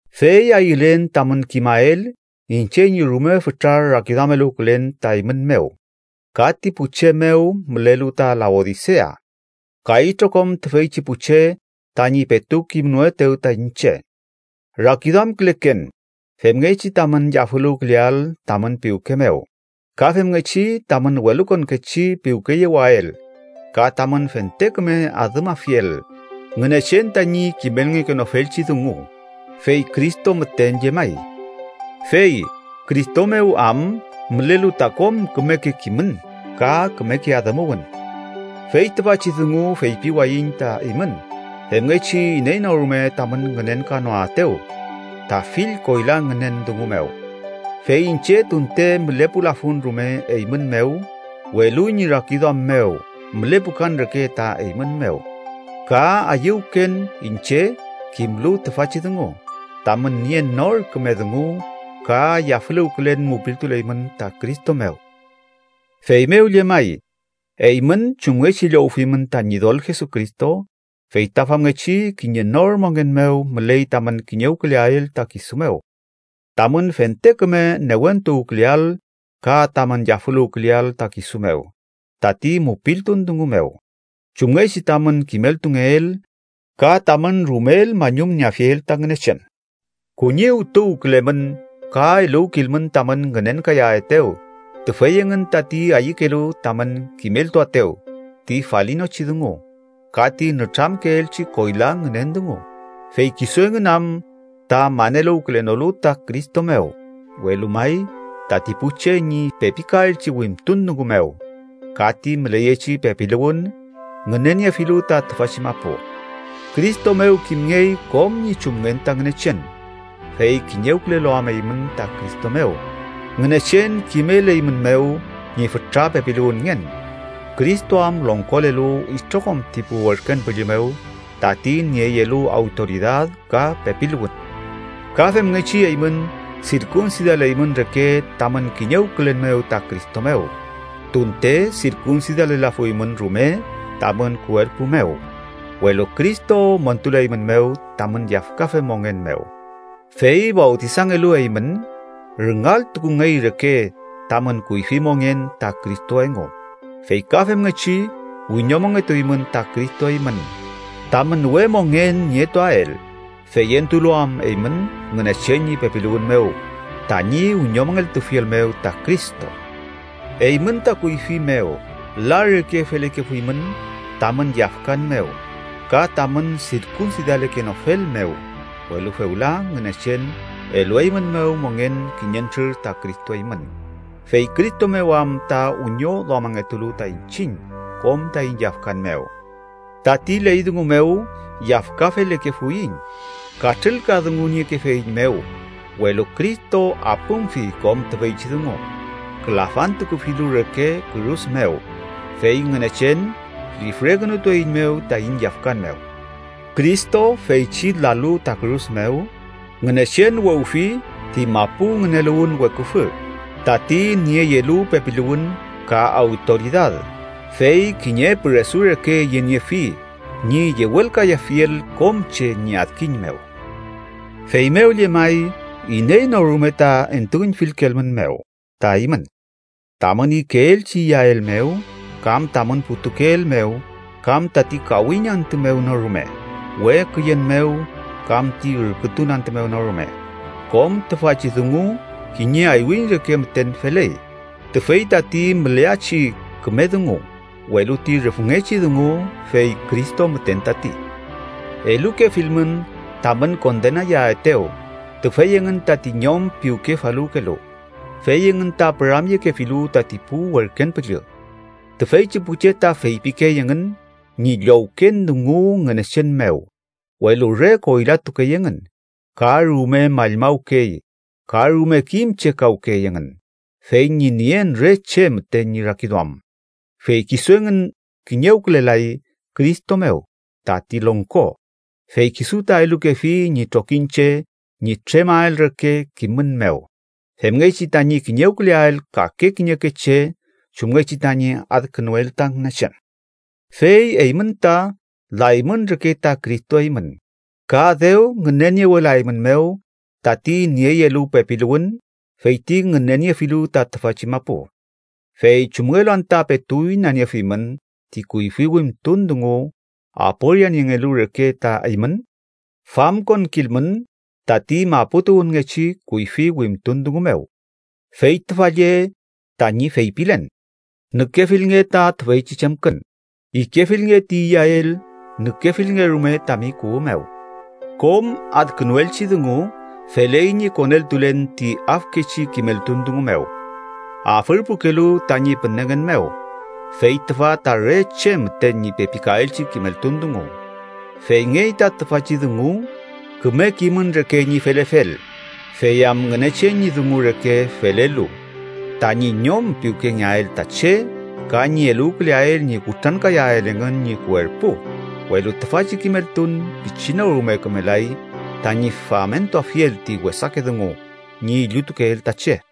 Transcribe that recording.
Fey ayülen tamün kimael iñche ñi rume fütra rakiduameluwkülen ta eymün mew, ka ti pu che mew mülelu ta Laodisea, ka itrokom tüfeychi pu che tañi petu kimnoetew ta iñche. Rakiduamküleken femngechi tamün yafüluwküleael tamün piwke mew, ka femngechi tamün welukonkechi piwkeyewael ka tamün fente küme adümafiel Ngünechen tañi kimelngekenofelchi dungu, fey Cristo müten llemay. Fey Cristo mew am mülelu ta kom kümeke kimün ka kümeke adümuwün. Fey tüfachi dungu feypiwayiñ ta eymün femngechi iney no rume tamün ngünenkanoaetew ta fill koyla ngünen dungu mew. Fey iñche tunte mülepulafun rume eymün mew, welu ñi rakiduam mew mülepukan reke ta eymün mew, ka ayüwken iñche kimlu tüfachi dungu: tamün nien nor küme dungu ka yafüluwkülen mupiltuleymün ta Cristo mew. Feymew llemay, eymün chumngechi llowfimün ta Ñidol Jesucristo, fey ta famngechi kiñe nor mongen mew müley tamün kiñewküleael ta kisu mew tamün fente küme newentuwküleael ka tamün yafüluwküleael ta kisu mew tati mupiltun dungu mew, chumngechi tamün kimeltungeel, ka tamün rumel mañumnieafiel ta Ngünechen. Kuñiwtuwkülemün ka eluwkilmün tamün ngünenkayaetew tüfey engün tati ayükelu tamün kimeltuaetew ti falinochi dungu ka ti nütramkeelchi koyla ngünen dungu, fey kisu engün am ta maneluwkenolu ta Cristo mew, welu may, tati pu che ñi pepikaelchi wimtun dungu mew ka ti müleyechi pepiluwün ngüneniefilu ta tüfachi mapu. Cristo mew kimngey kom ñi chumngen ta Ngünechen, fey kiñewkülelu am eymün ta Cristo mew Ngünechen kimeleymünmew ñi fütra pepiluwünngen, Cristo am longkolelu itrokom ti pu werken püllü mew, tati nieyelu awtoridad ka pepiluwün. Ka femngechi eymün sirkunsidaleymün reke tamün kiñewkülen mew ta Cristo mew, tunte sirkunsidalelafuymün rume tamün kuerpu mew, welu Cristo montuleymünmew tamün yafkafe mongen mew. Fey fawtisangelu eymün, rüngaltukungey reke tamün kuyfi mongen ta Cristo engu, fey ka femngechi wiñomongetuymün ta Cristo eymün tamün we mongen nietuael, feyentulu am eymün Ngünechen ñi pepiluwün mew, tañi wiñomongeltufiel mew ta Cristo. Eymün ta kuyfi mew, la reke felekefuymün tamün yafkan mew ka tamün sirkunsidalekenofel mew, welu fewla Ngünechen elueymünmew mongen kiñentrür ta Cristo eymün, fey Cristo mew am ta wiñoduamangetulu ta iñchiñ kom taiñ yafkan mew. Tati ley dungu mew yafkafelekefuiñ, katrülkadunguniekefeiñmew, welu Cristo apümfi kom tüfeychi dungu külafantukufilu reke kürus mew, fey Ngünechen lifrekünutueiñmew taiñ yafkan mew. Cristo feychi lalu ta kürus mew, Ngünechen wewfi ti mapu ngüneluwün weküfü tati nieyelu pepiluwün ka awtoridad, fey kiñe püresu reke yeniefi ñi yewelkayafiel kom che ñi adkiñ mew. Feymew llemay, iney no rume ta entuüñfilkelmünmew ta eymün tamün ikeelchi iyael mew kam tamün putukeel mew kam tati kawiñ antü mew no rume, we küyen mew kam ti ürkütun antü mew no rume. Kom tüfachi dungu kiñe aywiñ reke müten feley, tüfey tati müleachi küme dungu, welu ti rüfngechi dungu fey Cristo müten tati. Elukefilmün tamün kondenayaetew tüfey engün tati ñom piwkefaluwkelu, fey engün ta püramyekefilu tati pu werken püllü. Tüfeychi pu che ta feypikey engün ñi llowken dungu Ngünechen mew welu re koylatukey engün, ka rume mallmawkey ka rume kim chekawkey engün fey ñi nien re che müten ñi rakiduam. Fey kisu engün kiñewkülelay Cristo mew, tati longko, fey kisu ta elukefi ñi trokiñche ñi tremael reke kimün mew, femngechi tañi kiñewküleael kake kiñeke che chumngechi tañi adkünuel ta Ngünechen. Fey eymün ta laymün reke ta Cristo eymün, ka dew ngüneniewelaeymünmew tati nieyelu pepiluwün feyti ngüneniefilu ta tüfachi mapu. ¿Fey chumngelu anta petu inaniefimün ti kuyfi wimtun dungu aporianiengelu reke ta eymün? Famkonkilmün tati mapu tuwünngechi kuyfi wimtun dungu mew, fey tüfa lle tañi feypilen: “nükefilnge ta tüfeychi chemkün, ikefilnge ti iyael, nükefilnge rume tami kuwü mew”. Kom adkünuelchi dungu feley ñi koneltulen ti afkechi kimeltun dungu mew, afürpukelu tañi pünengen mew fey tüfa ta re che müten ñi pepikaelchi kimeltun dungu. Feyngey ta tüfachi dungu küme kimün reke ñi felefel, fey am Ngünechen ñi dungu reke felelu tañi ñom piwkengeael ta che ka ñi eluwküleael ñi kutrankayael engün ñi kuerpu, welu tüfachi kimeltun pichi no rume kümelay tañi famentuafiel ti wesake dungu ñi illutukeel ta che.